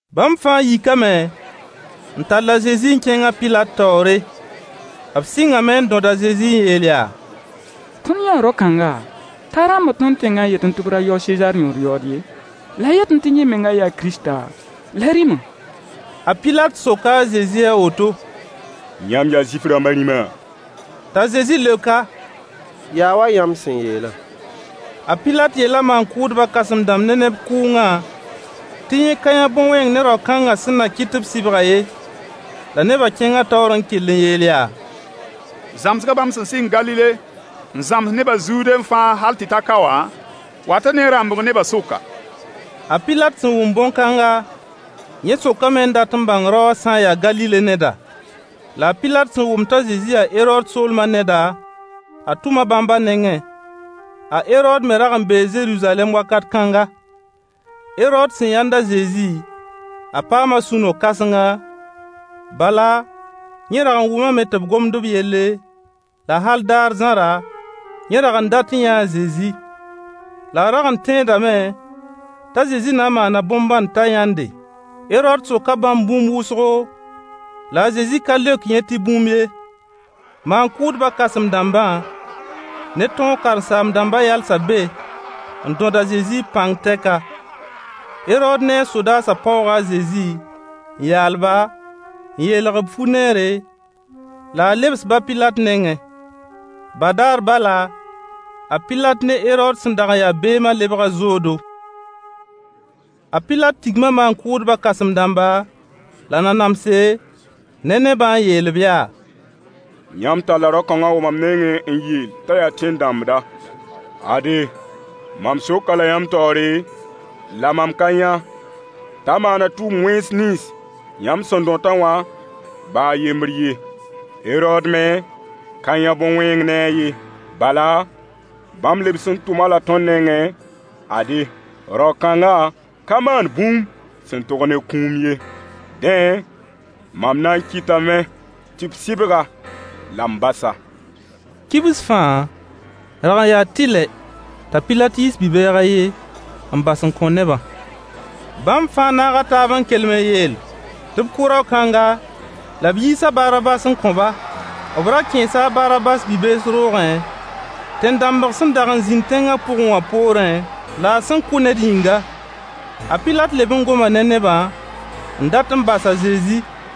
Bãmb fãa yikame n tall a Zezi n kẽng a Pilat taoore. B sɩngame n dõd a Zezi n yeel yaa: Tõnd yãa rao-kãnga t'a rãmbd tõnd tẽngã n yetẽ tɩ b ra yao a Sezaar yõor yaood ye. La a yetẽ tɩ yẽ menga yaa Kiristã, la rĩma. A Pilat soka a Zezi a woto: Yãmb yaa Zuif-rãmba rĩma? T'a Zezi leok-a: Yaa wa yãmb sẽn yeelã. A Pilat yeela maan-kʋʋdba kãsem-dãmb ne neb kʋʋngã tɩ yẽ ka yã bõn-wẽng ne rao-kãngã sẽn na kɩt tɩ b sɩbg-a ye. La nebã kẽnga taoor n kell n yeel yaa: Zãmsgã bãmb sẽn sɩng Galile n Zãms nebã Zude fãa hal tɩ ta ka wã wata ne rãmbg nebã sʋka. A Pilat sẽn wʋm bõn-kãnga, yẽ sokame n dat n bãng rao wã sã n yaa Galile neda. La a Pilat sẽn wʋm t'a Zezi yaa Herood soolma neda, a tʋma bãmb a nengẽ. A Herood me rag n bee Zeruzalɛm wakat kãnga. Herood sẽn yãnd a Zezi, a paama sũ-no-kãsenga, bala, yẽ rag n wʋmame tɩ b gomd b yelle, la hal daar zãra, yẽ rag n dat n yãa a Zezi. La a rag n tẽedame t'a Zezi na n maana bõn-bãnd t'a yãnde. Herood soka bãmb bũmb wʋsgo, la a Zezi ka leok yẽ tɩ bũmb ye. Maan-kʋʋdbã kãsem-dãmbã ne tõog karen-saam-dãmba yalsa be n dõd a Zezi b pãng tɛka. Herood ne a sodaasã paooga a Zezi, n yaal-ba, n yeelg-b fu-neere la a lebs-b a Pilat nengẽ. Badaar bala, a Pilat ne Herood sẽn dag n ya beemã lebga zoodo. A Pilat tigma maan-kʋʋdba kãsem-dãmba la nanamse ne nebã n yeel-b yaa: Yãmb talla rao-kãnga n wa mam nengẽ n yeel t'a yaa tẽn-dãmbda. Ade, mam sok-a-la yãmb taoore la mam ka yã t'a maana tʋʋm-wẽns nins yãmb sẽn dõt-a wã ba a yembr ye. Herood me ka yã bõn-wẽng ne-a ye, bala, bãmb lebs n tʋm-a-la tõnd nengẽ. Ade, rao-kãnga ka maan bũmb sẽn tog ne kũum ye. Dẽ, mam na n kɩtame tɩ b sɩbg-a-la m bas-a. [ Kibs fãa, rag n yaa tɩlɛ t'a Pilat yiis bi-bɛɛg a ye n bas n kõ nebã.] Bãmb fãa naaga taab n kelem n yeel tɩ b kʋ rao-kãnga la b yiis a Barabas n kõ-ba. B ra kẽesa a Barabas bi-bees roogẽ tẽn-dãmbg sẽn dag n zĩnd tẽngã pʋgẽ wã poorẽ, la a sẽn kʋ ned yĩnga. A Pilat leb n goma ne nebã, n dat n bas a Zezi.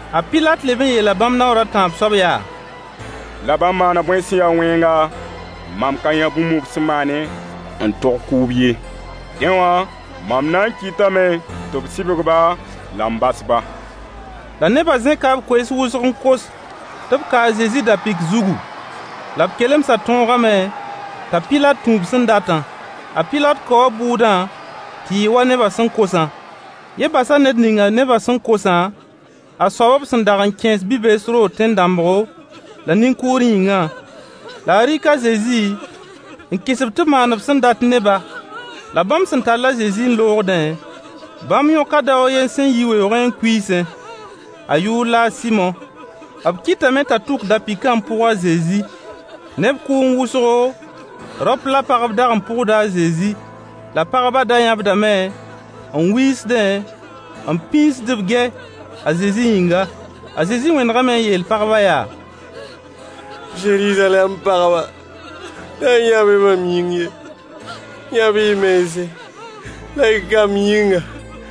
A Pilat leb n yeela bãmb naoor a tãab soab yaa: La bãmb maana bõe sẽn ya wẽnga? Mam ka yã bũmb b sẽn maane, n tog kʋʋb ye. Dẽ wã mam na n kɩtame tɩ b sɩbg-ba la m bas-ba. La neba zẽka b koees wʋsg n kos tɩ b ka a Zezi da-pɩk zugu. La b kelemsã tõogame t'a Pilat tũ b sẽn datã. A Pilat kaoo bʋʋdã tɩ yɩ wa nebã sẽn kosã. Yẽ basa ned ninga nebã sẽn kosã, a soab b sẽn dag n kẽes bi-bees roog tẽn-dãmbgo, la nin-kʋʋr yĩngã. La a rɩk a Zezi n kɩs-b tɩ b maan b sẽn dat ne-ba. La bãmb sẽn tall a Zezi n loogdẽ, bãmb yõka dao a yen sẽn yi weoogẽ n kuiisẽ. A yʋʋr la Sɩmo. B kɩtame t'a tʋk da-pɩkã n pʋg a Zezi. Neb kʋʋng wʋsgo, raop la pagb dag n pʋgda a Zezi. La pagbã da yãbdame, n wiisdẽ, n pĩisd b gɛy a Zezi yĩnga. A Zezi wẽnegame n yeel pagbã yaa: Zeruzalɛm pagba, da yãb-y mam yĩng ye. Yãb-y y mense, la y kamb yĩnga.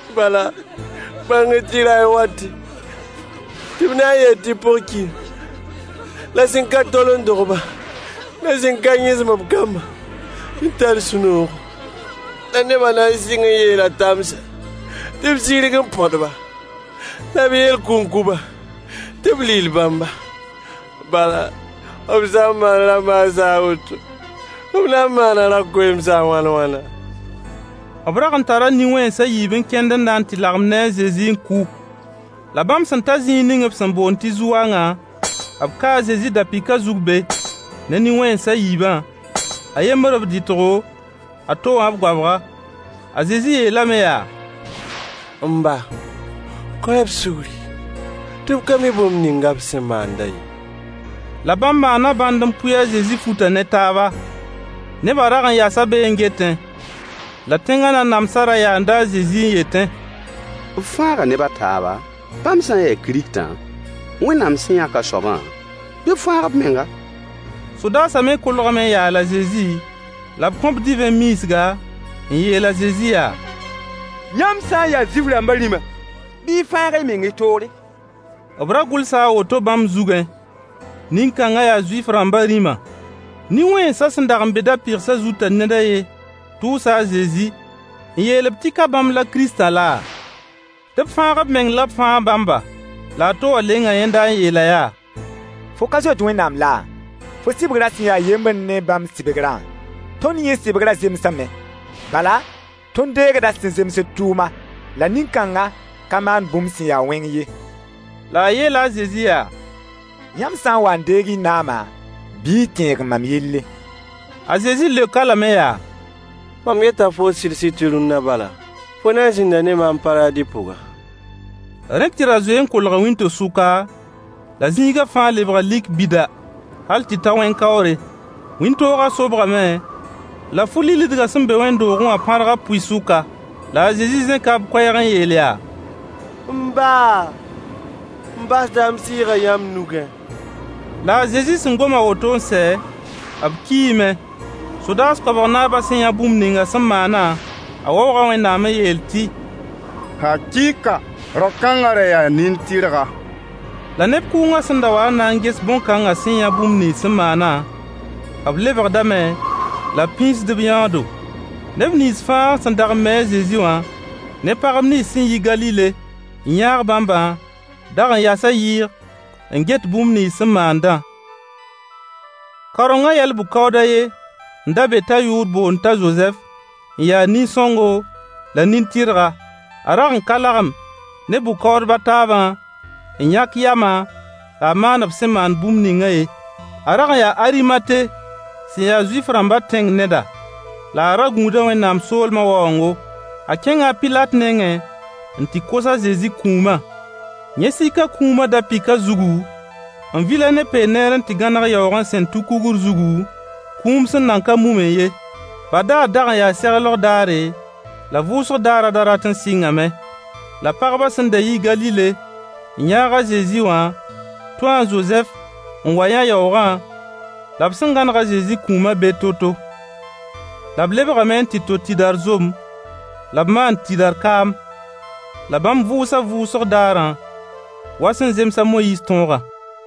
Bala, bãng-y tɩ ray n wate, tɩ b na n yeel tɩ pʋg-kiyã la sẽn ka tol n dog-bã, la sẽn ka yẽsem-b kambã n tar sũ-noogo. La nebã na n sɩng n yeela tãmsa tɩ b sirg n põd-ba, la b yeel kũnkuba tɩ b lill bãmba. Bala, b sã n maand ra-maas a woto, b na n maana ra-koeemsã wãn-wãna? B rag tara nin-wẽns a yiib n kẽnd n na tɩ lagem ne a Zezi n kʋ. La bãmb sẽn ta zĩig ninga b sẽn boond tɩ zu-wangã, b kaa a Zezi da-pɩkã zug be, ne nin-wẽns a yiibã: A yembr b rɩtgo a to wã b goabga. A Zezi yeelame yaa: M ba, kõ-y-b sugri, tɩ b ka mi bũmb ninga b sẽn maandã ye. La bãmb maana bãnd n pʋɩ a Zezi futã ne taaba. Nebã rag yasa be n getẽ. La tẽnga nanamsa ra yaanda a Zezi n yetẽ: B fãaga neb a taaba, bãmb sã n yaa Kiristã, Wẽnnaam sẽn yãk a soabã, bɩ b fãag b menga. Sodaasã me kolgame n yaal a Zezi, la b kõ-b divẽ miisga, n yeel a Zezi yaa: Yãmb sã n yaa Zuif-rãmbã rĩma, bɩ y fãag y meng y toore. B ra gʋlsa a woto bãmb zugẽ: Nin-kãnga yaa Zuif-rãmbã rĩma. Nin-wẽnsã sẽn dag n be da-pɩgsã zutã ned a yen tʋʋsa a Zezi n yeel-b tɩ ka bãmb la Kiristã laa? Tɩ b fãag b meng la b fãag bãmba. La a to wã lenga yẽnda n yeel-a yaa: Fo ka zoet Wẽnnaam laa? Fo sɩbgrã sẽn ya yembr ne bãmb sɩbgrã? Tõnd yẽ sɩbgrã zemsame. Bala, tõnd deegda sẽn zems d tʋʋma. La nin-kãngã ka maan bũmb sẽn ya wẽng ye. La a yeela a Zezi yaa: Yãmb sã n wa n deeg y naamã, bɩ y tẽeg mam yelle. A Zezi leok-a lame yaa: “Mam yeta foo sɩd-sɩd tɩ rũnna bala, fo na n zĩnda ne maam Paradi pʋga.” Rẽ tɩ ra zoe n kolga wĩnto-sʋka, la zĩiga fãa lebga lik bida hal tɩ ta wẽn-kaoore. Wĩntoogã sobgame, la fu-lillidgã sẽn be wẽnd-doogẽ wã pãrga pʋɩ-sʋka. La a Zezi zẽka b koɛɛg n yeel yaa: M ba, m basda m sɩɩgã yãmb nugẽ. La a Zezi sẽn gom a woto n sɛ, b kiime. Sodaas koabg naabã sẽn yã bũmb ninga sẽn maana, a waooga Wẽnnaam n yeel tɩ: Hakɩɩka rao-kãnga ra yaa nin-tɩrga. La neb kʋʋngã sẽn da wa n na ges bõn-kãngã sẽn yã bũmb nins sẽn maana, b lebgdame la b pĩisd b yãoodo. Neb nins fãa sẽn dag n mi a Zezi wã, ne pagb nins sẽn yi Galile n yãag bãmbã dag n yasa yɩɩg n get bũmb nins sẽn maandã. Kaorengã yɛl-bʋ-kaood a ye n da be t'a yʋʋr boond t'a Zozɛf n ya nin-sõngo la nin-tɩrga. A rag n ka lagem ne bʋ-kaoodb a taabã n yãk yama la a maan b sẽn maan bũmb ningã ye. A rag n yaa Arimate sẽn ya Zuif-rãmba tẽng neda. La a ra gũuda Wẽnnaam soolmã waoongo. A kẽnga a pilat nengẽ n tɩ kos a Zezi kũumã. Yẽ sika kũumã, da-pɩkã zugu, n vil-a ne lẽ peend n tɩ gãneg yaoogẽ sẽn tu kugr zugu, kũum sẽn nan ka mumẽ ye. Badaar dag n yaa seglg daare, la vʋʋsg daarã da rat n sɩngame. La pagbã sẽn da yi Galile n yãag a Zezi wã tũu a Zozɛf n wa yã yaoogã la b sẽn gãneg a Zezi kũuma be to-to. La b lebgame n tɩ to tɩdar zom la b maan tɩdar kaam. La bãmb vʋʋsa vʋʋsg daarã wa sẽn zems a Moyiis toogã.